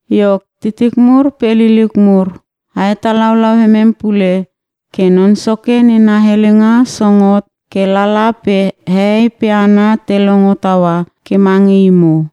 Iok titik mur pe liliuk mur, a hetalaulau emem pule ke Non Soke nena helenga song hotot ke lala pe hehei pe hana te longo taua ke mange imo.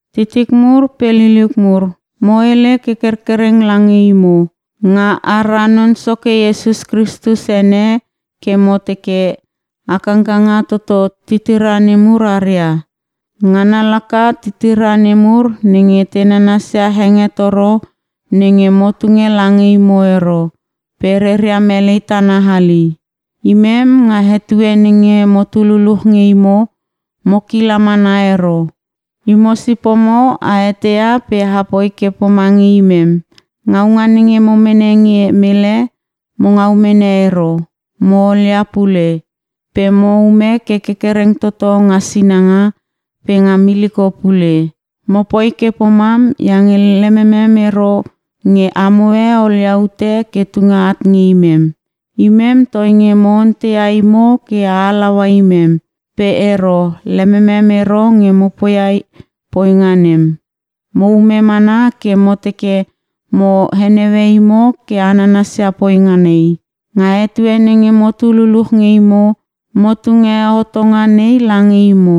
Titik mur pe liliuk mur, mo hele ke kerkereng lange imo nga ara Non Soke Iesus Kristus ene ke mo teke, a kangkanga toto titira nemur aria. Ngana laka titira nemur nenge te nanasia hengetoro nenge mo tunge lange imo ero pe reria melei tana hali. Imem nga etue nenge motu luluch nge imo mo kila mana ero. Imo sipomo a eteia pe apoi ke pomange imem. Ngaunga nenge mo mene nge mele, mo ngau mene ero, mo olia pule. Pe mo ume ke kerkereng toto nga sinanga pe nga miliko pule. Mo poi ke pomam iange lememem ero nge amoe olia ute ke tunge at nge imem. Imem toinge mo onteia imo ke a halaua imem, pe ero lememem ero nge mo poia poinga nem. Mo ume mana ke mo teke mo heneue imo ke a nanasia poinga nei. Nga etue nenge motu luluch nge imo, mo tunge hotonga nei lange imo,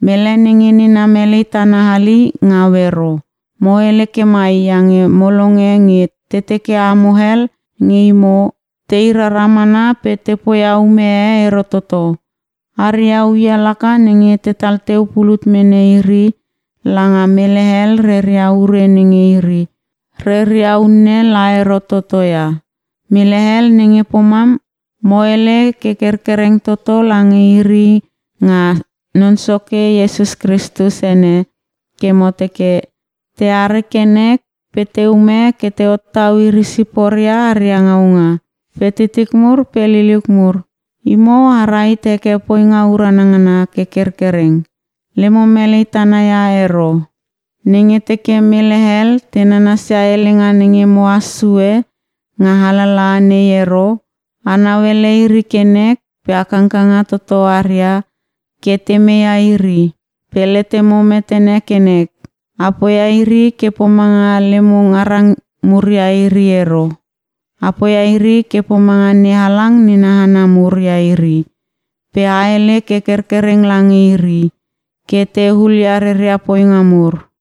“Mele nenge nena melei tana hali ngau ero.” Mo hele ke mai iange mo longe nge te teke amo hel nge imo, tei rara mana pe te poia ume e ero toto. Aria uia laka nenge tetal teu pulut mene iri langa mele hel reria ure nenge iri reria unne la ero toto ia. Mele hel nenge pomam, mo hele ke kerkereng toto lange iri nga Non Soke Iesus Kristus ene ke mo teke: Te are ke nek pe teume ke te hottau iri siporia aria ngaunga. Pe titik mur pe liliuk mur, imo a rahit heke poinga urana ngana ke kerkereng, lemo melei tana ia ero. Nenge teke mele hel te nanasia helenga nenge mohas sue nga alalaha nei ero, a nauele iri ke nek pe a kangkanga toto aria ke te meia iri. Pe letemo metene ke nek: Apoia iri ke pomanga lemo ngarang mur ia iri ero, a poia iri ke pomanga NeHalang nena hana mur ia iri pe a hele ke kerkereng lange iri ke te hulia reria poinga mur.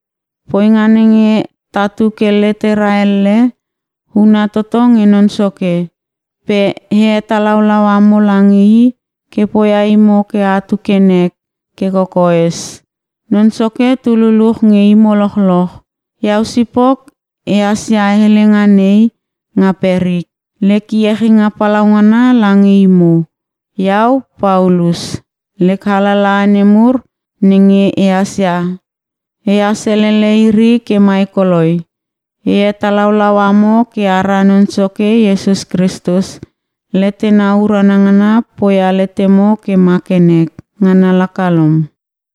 Poinga nenge tatu ke letera elle, huna toto nge Non Soke. Pe e hetalaulau amo lange I ke poia imo ke atu ke nek ke kokoes. Non Soke tu luluch nge imo lochloch. Iau sipok ehas ia helenga nei nga perik: Lek iechinga palaungana lange imo. Iau Paulus. Lek alalaha nemur nenge ehas ia, ehas elele iri ke mai koloi. E hetalaulau amo ke ara Non Soke Iesus Kristus letena urana ngana poia letemo ke ma ke nek. Ngana laka lom.